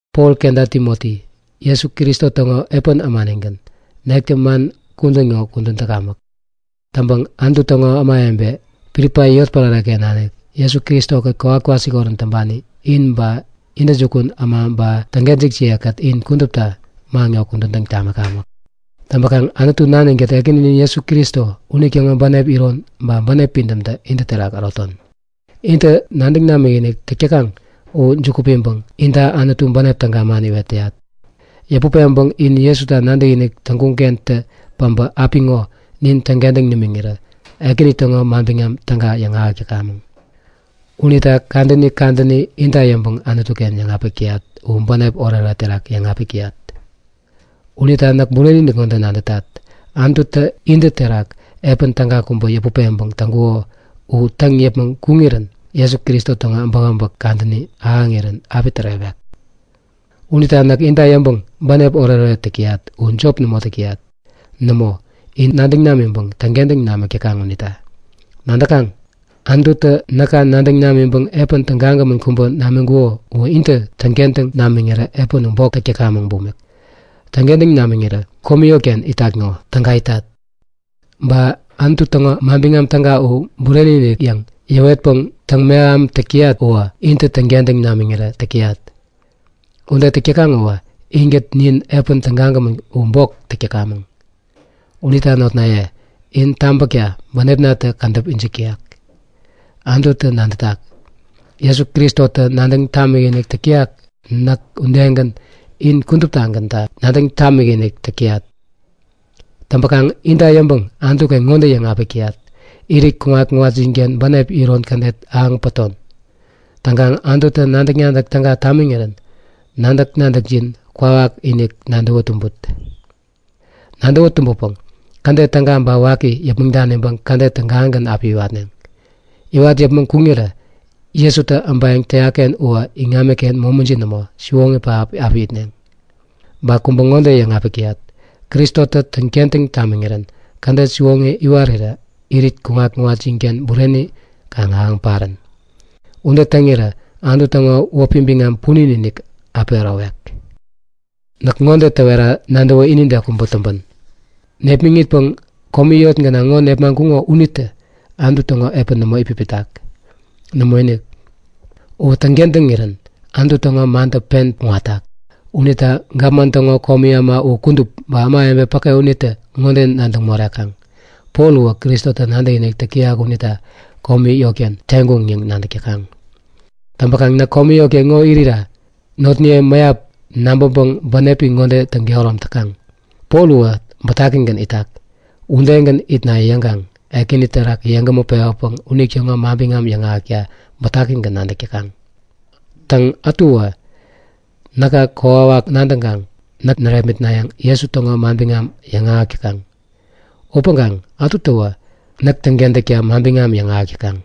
Pol kenta Timoti, Jesu Kristo täŋo epän ämanigän, nektä man kudän ŋo kudän täkamäk. Täŋpäŋ Anutu täŋo kudupi ämawebe, Pilipai yotpärare-ken nanik, Jesu Kristo-kät kowat kwasikorän täŋpani, in ba intäjukun äma ba täŋkentäkjiye-kät in kudupta man ŋo kudän täŋ tamikamäk. Täŋpäkaŋ Anutu Nanin-kät Ekäninin Jesu Kristo unitäŋo bänep iron ba bänep pidämtä intä terak äroton. Intä nadäŋ namikinik täk täkaŋ u juku piŋpäŋ inta Anutu bänep täga man iwet täyat. Yäput peŋpäŋ in Jesuta nadäkinik täŋkuŋ-kentä päbä apiŋo nin täŋkentäŋ nimiŋirä Ekäni täŋo Manbiŋam Täga yäŋahäk täkamäŋ. Unita kadäni kadäni inta yäŋpäŋ Anutu-ken yäŋapik täyat u bänep oretoret terak yäŋapik täyat. Unita näk bureni-inik ŋode nadätat; Anututä intä terak epän täga kubä yäput peŋpäŋ täŋkuko u täŋ yäpmäŋ kuŋirän Jesu Kristo täŋo äbäkäbäk kadäni ahäŋirän api tärewek. Unita näk inta yäŋpäŋ bänep oretoret täk täyat u jop nämo täk täyat. Nämo, in nadäŋ namiŋpäŋ täŋkentäŋ namik täkaŋ unita. Nadäkaŋ? Anututä näka nadäŋ namiŋpäŋ epän tägagämän kubä namiŋkuko uwä intä täŋkentäŋ namiŋirä epän u bok täk täkamäŋ bumik. Täŋkentäŋ namiŋirä komi yotken itat ŋo, täga itat. Ba Anutu täŋo Manbiŋam Täga u bureni-inik yäŋ yäwetpäŋ täŋmeham täk täyat uwä, intä täŋkentäŋ namiŋirä täk täyat. Ude täk täkaŋ uwä inkät nin epän tägagämän u bok täk täkamäŋ. Unita notnaye, in tabäkta bänepnatä kädäp ijik täyak. Anututä nadätak, Jesu Kristotä nadäŋ tamikinik täyak näk udegän in kuduptagänta nadäŋ tamikinik täk täyat. Täŋpäkaŋ inta yäŋpäŋ Anutu-ken ŋode yäŋapik täyat; Irit kuŋat-kuŋatjinken bänep iron kädet ahäŋ päton. Täŋkaŋ Anututä nadäk-nadäk täga tamiŋirän nadäk-nadäkjin kwawakinik nadäwä tumbut. Nadäwä tumbäpäŋ kädet täga ba waki yäpmäŋ daniŋpäŋ kädet tägagän api iwatneŋ. Iwat yäpmäŋ kuŋirä Jesutä äbayäŋ täyak-ken uwä iŋamiken momijin nämo, siwoŋi pähap api itneŋ. Ba kubä ŋode yäŋapik täyat; Kristotä täŋkentäŋ tamiŋirän kädet siwoŋi iwarirä irit kuŋat-kuŋatjinken bureni kaŋ ahäŋ parän. Ude täŋirä Anutu täŋo wäpi biŋam punin-inik api ärowek. Näk ŋode täwerira nadäwä inide kubä täŋpän. Nepmäŋitpäŋ komi yot gänaŋ ŋo nepmaŋkuŋo unitä Anutu täŋo epän nämo itpipitak. Nämoinik! Uwä täŋkentäŋirän Anutu täŋo mantä pen kuŋatak! Unita gapman täŋo komi äma u kudup, ba ämawebe päke unitä ŋode nadäŋ morekaŋ; Pol uwä Kristota nadäkinik täyak unita komi yotken teŋkuŋ yäŋ nadäk täkaŋ. Täŋpäkaŋ näk komi yotken ŋo irira notniye mäyap nabäŋpäŋ bänepi ŋode täŋkehärom täkaŋ; Pol u bätakigän itak, udegän itna yäŋkaŋ Ekäni terak yeŋgämä pewäpäŋ unitäŋo manbiŋam yäŋahäkta bätakigän nadäk täkaŋ. Täŋ, ätuwä näka kokwawak nadäŋkaŋ näk närepmitnayäŋ Jesu täŋo manbiŋam yäŋahäk täkaŋ. Upäŋkaŋ ätutäwä näk täŋkentäkta manbiŋam yäŋahäk täkaŋ.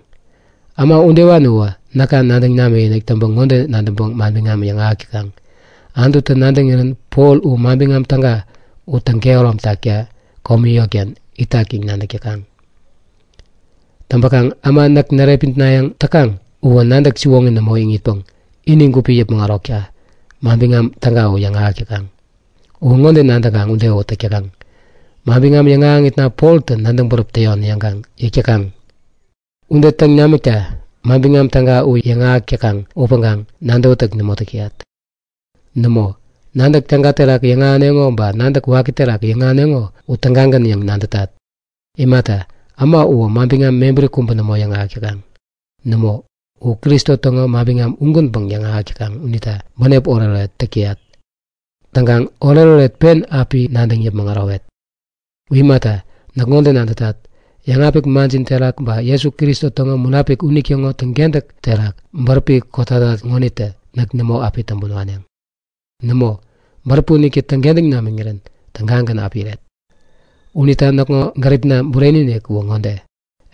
Äma udewani uwä näka nadäŋ namikinik täŋpäŋ ŋode nadäŋpäŋ manbiŋam yäŋahäk täkaŋ; Anututä nadäŋirän Pol u Manbiŋam Täga u täŋkehärom takta komi yotken itak yäŋ nadäk täkaŋ. Täŋpäkaŋ äma näk närepmitnayäŋ täkaŋ uwä nadäk siwoŋi nämo iŋitpäŋ ini gupi yäpmäŋ ärokta, Manbiŋam Täga u yäŋahäk täkaŋ. Uwä ŋode nadäŋkaŋ ude uwä täk täkaŋ; Manbiŋam yäŋahäŋitna Poltä nadäŋ bäräp täyon yäŋkaŋ yäk täkaŋ. Ude täŋ namikta Manbiŋam Täga u yäŋahäk täkaŋ upäŋkaŋ nadäwätäk nämo täk täyat. Nämo, nadäk täga terak yäŋahäneŋo ba nadäk waki terak yäŋahäneŋo u tägagän yäŋ nadätat. Imata, äma uwä manbiŋam mebäri kubä nämo yäŋahäk täkaŋ. Nämo! U Kristo täŋo manbiŋam ugänpäŋ yäŋahäk täkaŋ unita bänep oretoret täk täyat. Täŋkaŋ oretoret pen api nadäŋ yäpmäŋ ärowet! U imata, näk ŋode nadätat; Yäŋapik manjin terak ba Jesu Kristo täŋo Munapik unitäŋo täŋkentäk terak bäräpi kotatat ŋonitä näk nämo api täŋpän waneŋ. Nämo, bäräpi unitä täŋkentäŋ namiŋirän tägagän api iret. Unita näkŋo gäripna bureni-inik uwä ŋode;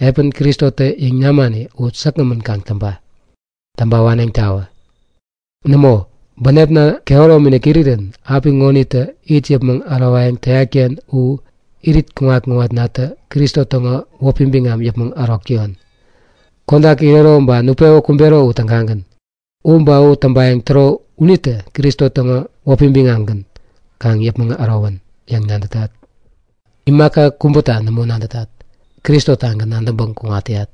Epän Kristotä yäŋ namani u säkgämän kaŋ täŋpa! Täŋpa waneŋtawä! Nämo! Bänepna kehäromi-inik irirän apiŋonitä it yäpmäŋ ärowayäŋ täyat-ken u, irit kuŋat-kuŋatnatä Kristo täŋo wäpi biŋam yäpmäŋ ärok täyon! Kodak irero ba nutpewä kumbero u tägagän. U ba u täŋpayäŋ täro unitä Kristo täŋo wäpi biŋamgän kaŋ yäpmäŋ ärowän yäŋ nadätat. Imaka kubäta nämo nadätat. Kristo-tagän nadäŋpäŋ kuŋat täyat.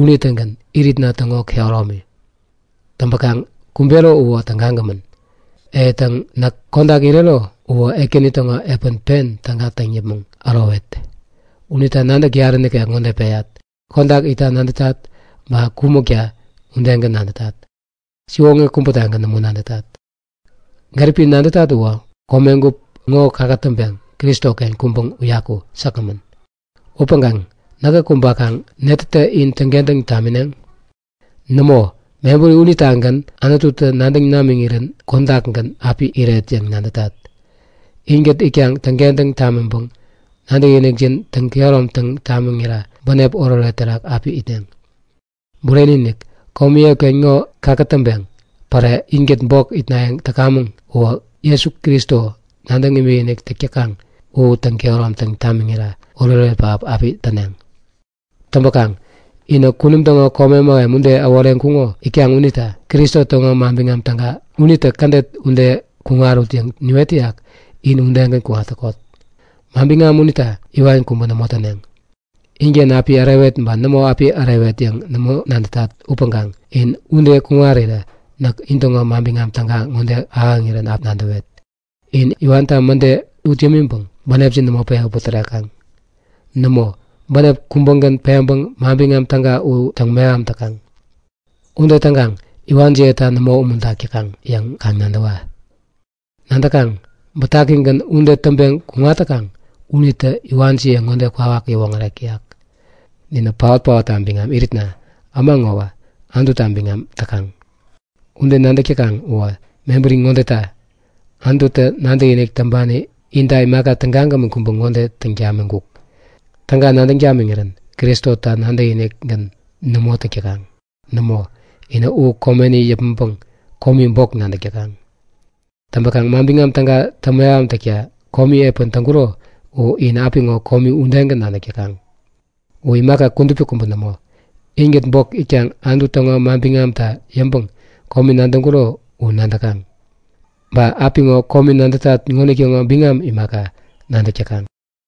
Unitägän iritna täŋo kehäromi. Täŋpäkaŋ kumbero uwä, tägagämän! E täŋ näk kodak irero uwä Ekäni täŋo epän pen täga täŋ yäpmäŋ ärowet. Unita nadäk yarä nikek ŋode peyat; Kodak itta nadätat, ba kumäkta udegän nadätat. Siwoŋi kubätagän nämo nadätat. Gäripi nadätat uwä komegup ŋo kakätäŋpeŋ Kristoken kuŋpäŋ uyaku säkgämän. Upäŋkaŋ näkä kumbakaŋ netätä in täŋkentäŋ tamineŋ? Nämo! Mebäri unitagän Anututä nadäŋ namiŋirän kodakgän api iret yäŋ nadätat. Inkät itkaŋ täŋkentäŋ tamiŋpäŋ nadäkinikjin täŋ-kehäromtaŋ tamiŋira bänep oretoret terak api itneŋ. Bureni-inik! Komi yot ŋo kakätäŋpeŋ päre inkät bok itnayäŋ täkamäŋ uwä Jesu Kristo nadäŋ imikinik täk täkaŋ u täŋ-kehäromtaŋ tamiŋira oretoret pähap api täneŋ. Täŋpäkaŋ, inä kunum täŋo kome mähem ude äworeŋkuŋo itkaŋ unita Kristo täŋo Manbiŋam Täga unitä kädet ude kuŋarut yäŋ niwet täyak in udegän kuŋat täkot! Manbiŋam unita iwan kubä nämo täneŋ. Inken api ärewet ba nämo api ärewet yäŋ nämo nadätat upäŋkaŋ in ude kuŋarirä näk intäŋo Manbiŋam Täga ŋode ahäŋirän api nadäwet; In iwanta mäde ut yämiŋpäŋ bänepjin nämo pewä putärekaŋ. Nämo, bänep kubägän peŋpäŋ Manbiŋam Täga u täŋmeham täkaŋ. Ude täŋkaŋ iwanjiyeta nämo umuntak täkaŋ yäŋ kaŋ nadäwa. Nadäkaŋ? Bätakigän ude täŋpeŋ kuŋat täkaŋ unitä iwanjiye kwawak ŋode yäwoŋärek täyak; Ninä paot-paotta biŋam iritna äma ŋowä Anututa biŋam täkaŋ! Ude nadäk täkaŋ uwä mebäri ŋodeta; Anututä nadäkinik täŋpani inta imaka tägagämän kubä ŋode täŋ tamiŋkuk; Täga nadäŋ tamiŋirän Kristota nadäkinik-gän nämo täk täkaŋ. Nämo, inä u komeni yäpmäŋpäŋ komi bok nadäk täkaŋ. Täŋpäkaŋ Manbiŋam Täga täŋmeham täkta komi epän täŋkuro u in apiŋo komi udegän nadäk täkaŋ. Uwä imaka kudupi kubä nämo. Inkät bok itkaŋ Anutu täŋo manbiŋamta yäŋpäŋ komi nadäŋkuro u nadäkaŋ. Ba apiŋo komi nadätat ŋonitäŋo biŋam imaka, nadäk täkaŋ.